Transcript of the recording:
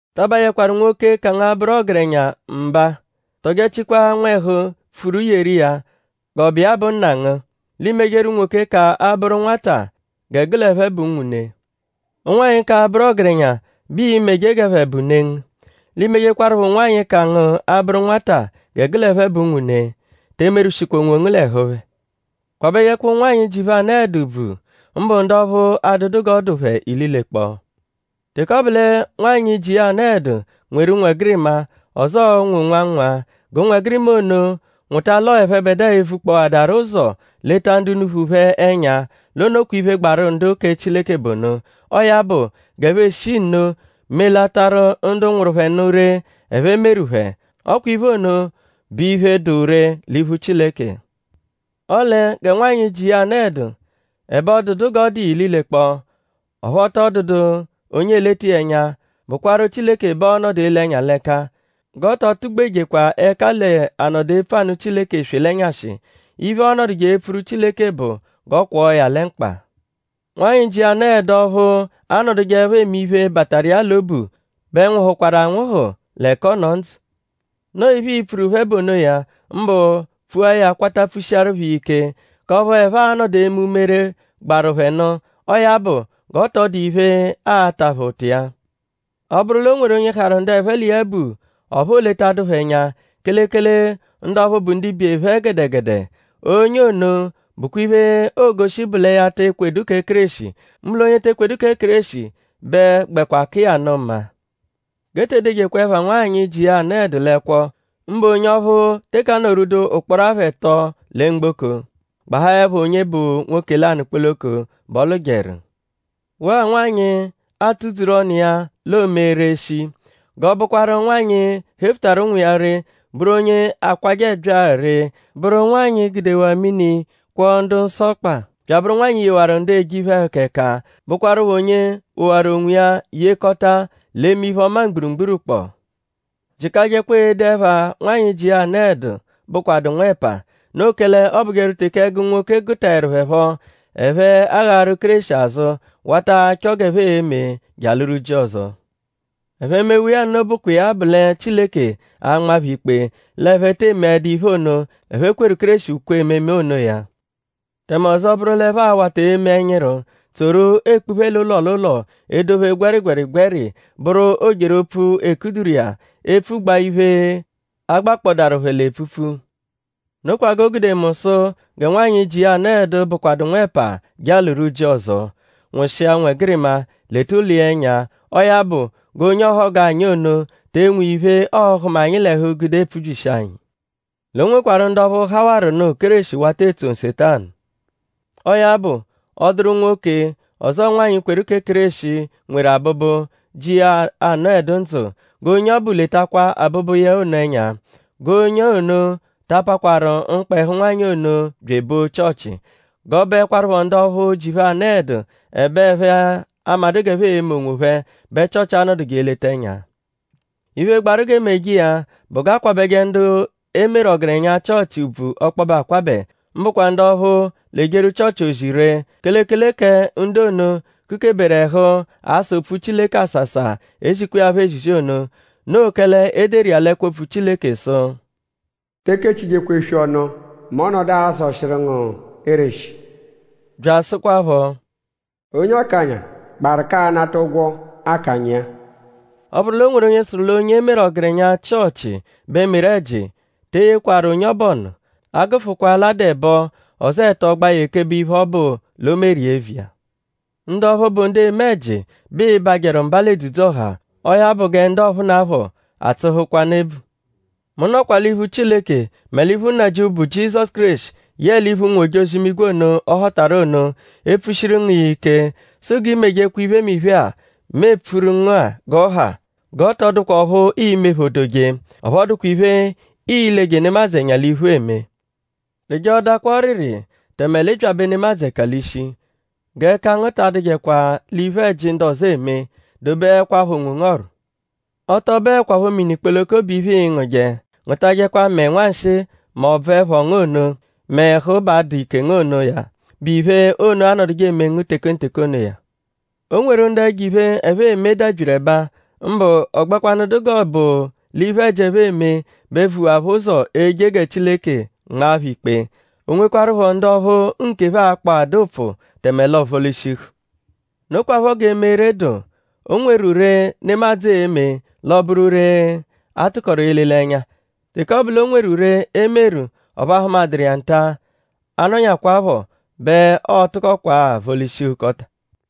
Ta abajẹkwaru nwoke, ka ngu abụru ọgerenya mba; tọjechikwa nwẹhu pfuru yeru iya g'ọ bụ iya bụ nna ngu. L'i mejeru unwoke, ka abụru nwata gẹ gụ l'ẹphe bụ unwune. Ụnwanyi ka abụru ọgerenya bẹ ịi-meje g'ẹphe bụ ne ngu. L'iimejekwarụpho ụnwanyi, ka ngu abụru nwata gẹ gụ l'ẹphe bụ unwune. Te emerwụshikwa onwongu l'ẹhu phẹ. Kwabẹjekwa ụnwanyi, ji phẹ anọedu ùbvù; mbụ ndu ọphu adụdu g'ọ dụ phẹ ililekpọo. Teke ọ bụ lẹ nwanyị, ji iya anọedu nweru ụnwegirima; ọzoo ụnwu nwa-nwa; g'ụnwegirima ono nwụta l'ọo ẹphebedua evukpọadaru ụzo leta ndu unuphu phẹ ẹnya; l'o nokwa iphe, gbaru ndu kẹ Chileke bụ ono. Ọo ya bụ; g'ẹphe eshi nno melataru ndu nwụru phẹ nụ ree, ẹphe meru phẹ. Ọ kwa iphe ono bụ iphe, dụ ree l'iphu Chileke. Ọle gẹ nwanyị, ji iya anọedu; ẹbe ọ dụdu g'ọ dụ iya ililekpọo; ọphu ọ tọ dụdu onye eleta iya ẹnya; bụkwaru Chileke bẹ ọo-nọdu ele ẹnya l'ẹka. G'ọ tọ tụ-gbejekwa ẹka l'anọdu epfu anụ Chileke eswe l'ẹnyashi. Iphe, ọonoduje epfuru Chileke bụ g'ọ kwọo ya lẹ mkpa. Nwanyị, ji iya anọedu ọphu anọdujeepho eme iphe, bataru iya l'obu bẹ nwụhuakwaru anwụhu; l'ẹka ọ nọ ndzụ. Noo iphe, ii-pfuru phẹ bụ onoya; mbụ pfua ya kwata pfushiaru phẹ iya ike; k'ọphu ẹphe a-nọdu eme umere, gbaru phẹ nụ. Ọo ya bụ; g'ọ tọ dụ iphe, aa-ta phẹ ụta iya. Ọ -bụru l'o nweru onye harụ ndu ẹphe l'iya bụ; ọphu ooletadu phẹ ẹnya; kelekele ndu ọphu bụ ndibe phẹ gẹdegede; onye ono bụkwa iphe, oogoshi bụ lẹ ya te ekwedu kẹ Kéreshi; mbụ l'onye te ekwedu kẹ Kéreshi bẹ gbẹkwa ka iya nụ mma. G'e te edejekwa ẹpha nwanyị, ji iya anọedu l'ẹkwo; mbụ onye ọphu teke anọ-rwudu ụkporo apha ẹto lẹ mgboko; gbahaẹpho onye bụ nwoke lanụ kpoloko bẹ ọ lụjeru; waa nwanyị, aatụ-dzuru ọnu iya; l'oome ree shii. G'ọ bụkwaru nwanyị, hefutaru ụnwu iya ree; bụru onye akwajẹ ẹbyaa ree; bụru nwanyị, gudewaa mini kwọo ndu-nsọ ọkpa; bya abụru nwanyị, yewaru ndu eje iphe-ẹhuka ẹka; bụkwarupho onye wowaru onwiya yekọta l'eme iphe-ọma mgburugburu kpọo. Jịkajekwa ede ẹpha nwanyị, ji iya anọedu, bụkwadu nwẹpa. Noo kẹle ọobujeru teke ẹgu nwoke gụtaeru phẹ phọ; ẹphe aghaaru Kéreshi azụ wata achọ g'ẹphe e-me je alụru ji ọzo. Ẹphe -mewa iya nno bụkwa iya bụ lẹ Chileke a-nma phẹ ikpe l'ẹphe te emeẹdu iphe ono, ẹphe kweru Kéreshi ukwe ememe onoya. Tẹme ọzo bụru l'ẹphe a-wata eme ẹnyiru; tsoru ekpuphe l'ụlo l'ụlo edophe gwẹrigwerigweri; bụru o-jeru-opfu, 'e kuduru iya; epfugbaa iphe, agbakpọdaaru phẹ l'epfupfu. Nokwa g'o gude mu sụ gẹ nwanyị, ji iya anọedu, bụkwadu nwẹpa je alụru ji ọzo; nwụshia ụnwegirima; leta ụlo iya ẹnya. Ọo ya bụ; g'onye ọhogu anyi ono te enwe iphe, ọo-hụma anyi l'ẹhu gude epfubyishi anyi. L'o nwekwarụ ndu ọphu hawarụnu Kéreshi wata etso Nsetanu. Ọo ya bụ; ọ -dụru nwoke ọzo nwanyị kweru kẹ Kéreshi, nweru abụbu, ji iya anọedu ndzụ; g'onye ọbu letakwa abụbu iya ono ẹnya. G'onye ono ta apakwaru mkpa ẹhu nwanyị ono bya ebo Chịochi. G'ọ bụekwarupho ndu ọphu ji phẹ anọedu; ẹbe ẹphe amadụ g'ẹphe e-me onwophẹ bẹ Chịochi a-nọduje eleta ẹnya. Iphe, gbaru g'e meje iya bụ g'a kwabẹje ndu e meru ọgerenya Chịochi ùbvù ọkpobe akwabẹ; mbụkwa ndu ọphu l'ejeru Chịochi ozi ree; kelekele kẹ ndu ono, kukeberu ẹhu asa opfu Chileke asasa; ezikwa iya phọ ezizi ono. Noo kẹle e deru iya l'ẹkwo-opfu Chileke sụ: “Te ekechijekwa eswi ọnu mẹ ọ -nọdu azọshiru ngu ereshi.” Bya asụkwapho: “Onye akanya gbaru k'anata ụgwo akanya iya.” Ọ -bụru l'o nweru onye sụru l'onye e meru ọgerenya Chịochi bẹ meru ẹji; te eyekwaru onye ọbu ọnu; a -gụfukwa l'a dụ ẹbo; ọzoo ẹto gbaa ya ekebe iphe ọbu l'o meru iya eviya. Ndu ọphu, bụ ndu eme ẹji bẹ ịi-bajẹru mba l'edzudzu-ọha. Ọo ya bụ gẹ ndu ọphunapho atsụhukwanu ebvu. Mu nọkwa l'iphu Chileke; mẹ l'iphu Nnajịuphu, bụ Jizọsu Kéreshi yẹe l'iphu ụnwu-ojozi-imigwe ono, ọ họtaru ono epfushiru ngu iya ike sụ g'i mejekwa iphemiphe-a, mu epfuru ngu-a g'ọ ha; g'ọ tọ dụkwa ọphu ii-mephodoje. Ọphu ọ dụkwa iphe, ii-leje nemadzụ ẹnya l'iphu eme. Rịje-odakwa ọriri; tẹme l'ị byabẹ nemadzụ ẹka l'ishi. G'ẹka ngu ta adụjekwa l'iphe-ẹji, ndu ọzo eme. Dobeẹkwapho onwongu ọ̀rù. Ọ tọ bụekwapho mini kpoloko bụ iphe, ịi-ngụje. Ngụtajekwa mẹe nwanshịi m'ọbvu ẹpho ngu ono; mẹ ẹhu ba adụ ike ngu onoya, bụ iphe ono anọduje eme ngu tekenteke onoya. O nweru ndu ẹjo-iphe, ẹphe eme dabyiru ẹba; mbụ ọ gbẹkwanu dụ g'ọ bụ l'iphe-ẹji, ẹphe eme bẹ vuwaa phẹ ụzo eje gẹ Chileke nmaa phẹ ikpe. O nwekwarụpho ndu ọphu nkephẹ akpọadaa ụpfu tẹme l'ọo vọ-lishihu. Nokwaphọ g'eme ree dụ. O nweru ree, nemadzụ e-me l'ọ bụru ree, a tụkoru ele l'ẹnya. Teke ọ bụ l'o nweru ree, e meru; ọphu a hụmaduru iya nta; a -nọnyakwaapho bẹ ọo-tụkokwaa vọ-lishihukọta.